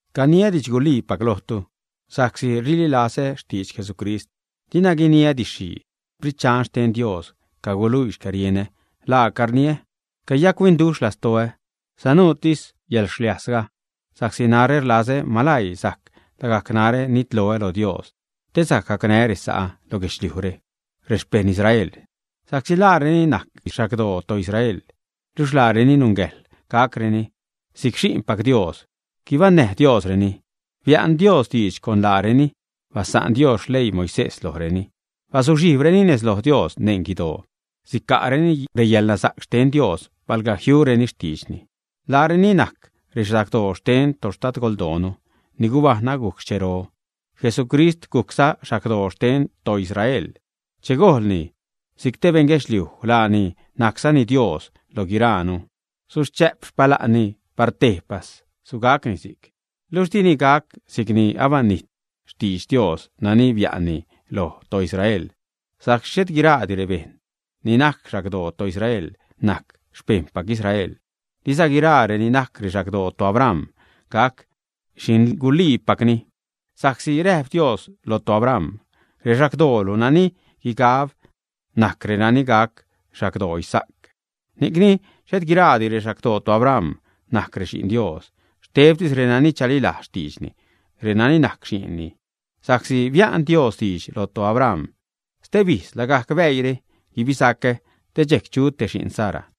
Caniä didxguliipac lojtu sa'csi rililazä xtidx Jesucrist. Dina guiniä didx-xhii. Sprit Dxan xten Dios caguluii xcärienä laaca rniä; cayac-huinduxh lastoä, sanuutis yäḻxliajsga. Sa'csi narä rlazä malaii sajc lagajc narä nitloä lo Dios te sajc gacnää́ resa'ä lo guedxliujre, rexpejṉ Israel. Sa'csi laareni najc xagdoo toIsrael, luxh laareni nungäjḻ gacreni si'c xi'npac Dios. Gubaṉnäj Diosreni. Bia'n Dios didx con laareni. Basa'n Dios xleii Moisés lojreni. Bazuxhijbreni nez lo Dios neṉ guidoo. Sica'reni reyäḻnasa'c xten Dios palga jiureni xtiidxni. Laareni najc rexagdoo xten toxtadgoldoonu ni gubajṉ agujc xhero. Jesucrist gujcza xagdoo xten toIsrael che gojlni si'c te beṉ guedxliuj. Laani najczani Dios loj guiraanu. Suchä'p xpala'nni par tejpas. Sugacni si'c. Luxh dini gac si'cni abanijt xtidx Dios nani bia'nni loj toIsrael. Sa'csi xhet guiraadi rebejṉ ni najc xagdoo toIsrael najc xpejṉpac Israel. Diza guiraa reni najc rexagdoo toAbram gac xi'nguliipacni sa'csi räjp Dios lo toAbram: “Rexagdodoolu nani guigab najc reni gac xagdoo Isaac.” Ni'cni xhet guiraadi rexagdoo toAbram najc rexi'n Dios, xtebtis renani chalilajz xtiidxni, reni'c najc xi'nni. Sa'csi bia'n Dios diidx loj toAbram: “Stebijz, lagajc bäiire guibisacä, te dxejc chu te xi'n Sara.”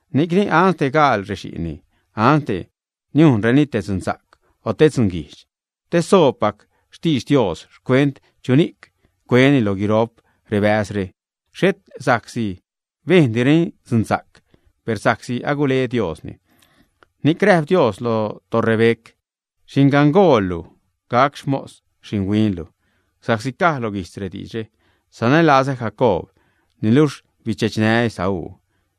Ni'cni ansde gaal rexi'nni, ansde niujnreni te dzunsa'c o te dzunguijdx, te soobpac xtidx Dios xcuent chuni'c cueni lo guiro'p rebäzre, xhet sa'csi bejndireni dzunsa'c, per sa'csi agule Diosni, ni'c räjp Dios lo toRebeca: “Xingangaloolu gac xmos xinhuinlu.” Si'cza caj lo guijtz rediidxre: “Sanälazä Jacoob, niluxh bidxechnää́ Esaú.”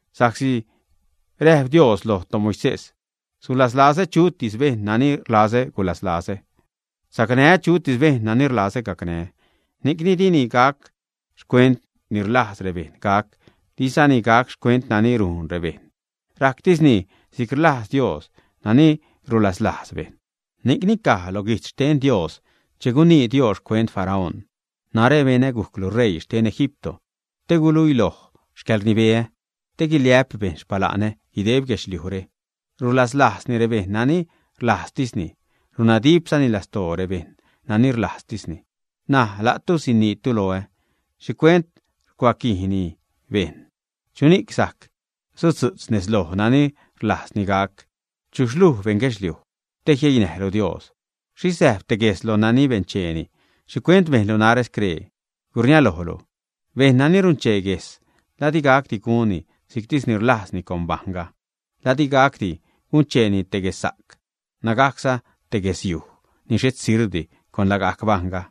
Sa'csi räjp Dios loj toMoisés: “Sulaslazä chutis bejṉ nani rlazä gulaslazä, sacnää́ chutis bejṉ nani rlazä gacnää́.” Ni'cni dini gac xcuent ni rlajz rebejṉ gac, dizani gac xcuent nani rujn rebejṉ. Rajctisni si'c rlajz Dios nani rulaslajz bejṉ. Ni'cni caj lo guijtz xten Dios che gunii Dios xcuent Faraón: “Narä benä gujclu ṟeii xten Egipto te guluiloj xcäḻrnibeä, te guiliä'p bejṉ xpala'nä guideb guedxliujre.” Rulaslajzni rebejṉ nani rlajztisni, runnadipzani lastoo bejṉ nani rlajztisni. Naj la'tu siniitu loä: “¿Xhicuent rucuaquijni bejṉ? ¿Chuni'c sajc sudzu'tz nez loj nani rlajzni gac, ä?” ¿Chuxh luj, beṉ guedxliuj, te jieinäjlu Dios? Xhixh säjb te gues loj nani bencheeni: “¿Xhicuent bejnlu narä scree?” Gurniälojlu. Bejṉ nani runchee guejs, ¿la di gacdi gunni si'ctisni rlajzni con bajṉga, ä? ¿La di gacdi guncheeni te guessa'c nägajcza te guesyuj ni xhet sirbdi con lagajc bajṉga?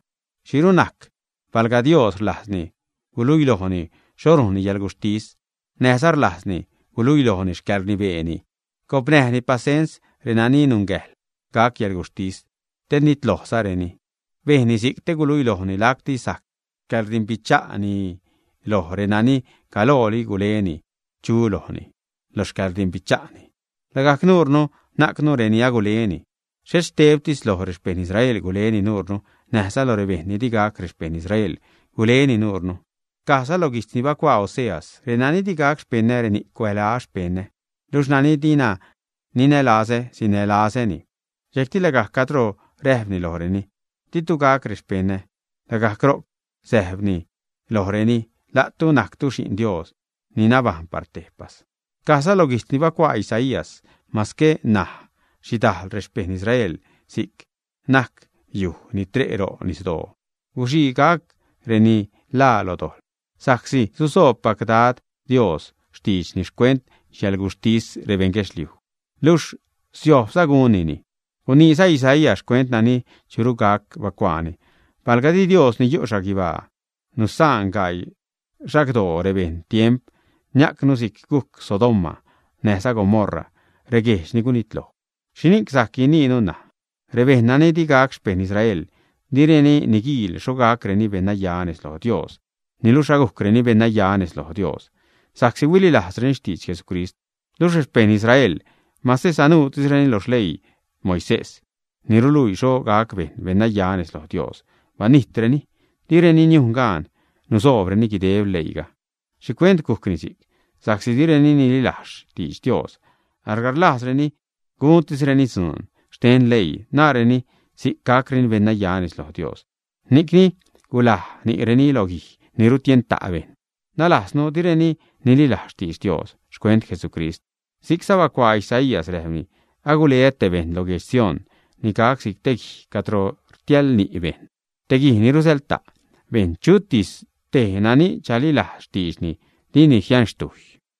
¿Xhiru najc, palga Dios rlajzni guluilojni xho rujnni yäḻguxhtis, näjza rlajzni guluilojni xcäḻrnibeeni, gopnäjni pasens renani nungäjḻ gac yäḻguxhtis, te nitlojzareni, ä? Bejnni si'c te guluilojni lacti sajc xcäḻrdimbicha'ni loj renani galooli guleni chú lojni lo xcäḻrdimbicha'ni. Lagajc nuurnu najcnu reni aguleni; xhet xtebtis loj rexpeṉ Israel guleni nuurnu, näjza loj rebejṉ ni di gac rexpeṉ Israel guleni nuurnu. Cajza lo guijtz ni bacuaa Oseas: Renani di gac xpeṉä, reni'c cuälaä “xpeṉä”. Luxh nani dina ninälazä, sinälazäni. Dxejcti lagajc cadro räjpreni lojreni: “Ditu gac rexpeṉä”, lagajc ro'c säjpreni lojreni: “La'tu najctu xi'n Dios ni nabajṉ par tejpas.” Cajza lo guijtz ni bacuaa Isaías: “Mase najc xhidajl rexpeṉ Israel si'c najc yujxh ni tre' ro' nisdoo, guxii gac reni ḻaa lo dojḻ. Sa'csi susoobpac Dad, Dios xtiidxni xcuent xcäḻguxhtis rebeṉ guedxliuj, luxh siojbza gunnini.” Guniiza Isaías, xcuent nani churu gac, bacuaani: Palga di Dios ni yu' xhaguibaa nusa'n gaii xagdoo rebeṉ tiemp, niajcnu si'c gujc Sodoma näjza Gomorra, reguejdx ni gunitloj. ¿Xhini'c sajc guiniinu ṉaj? Rebejṉ nani di gac xpeṉ Israel, direni niguiil xho gacreni beṉnaya nez loj Dios, niluxh agujcreni beṉnaya nez loj Dios sa'csi huililajzreni xtidx Jesucrist. Luxh rexpeṉ Israel, mase sanuutisreni lo xleii Moisés ni ruluii xho gac bejṉ beṉnaya nez loj Dios, banijtreni, direni niujn gaan nusoobreni guideb leiiga. ¿Xhicuent gujcni si'c? Sa'csi direni nililajz xtidx Dios, alga rlajzreni guntisreni dzuun xten leii, naareni si'c gacreni beṉnaya nez lo Dios. Ni'cni gulaj ni'reni lo guij ni rutienta' bejṉ, nalajznu direni nililajz xtidx Dios xcuent Jesucrist. Si'cza bacuaa Isaías, räjpni: Aguleä te bejṉ lo guedx Sión ni gac si'c te guij cadro rtiäjḻ ni' bejṉ, te guij ni rusäḻta' bejṉ. Chutis tej nani chalilajz xtiidxni, dini jianxtujy.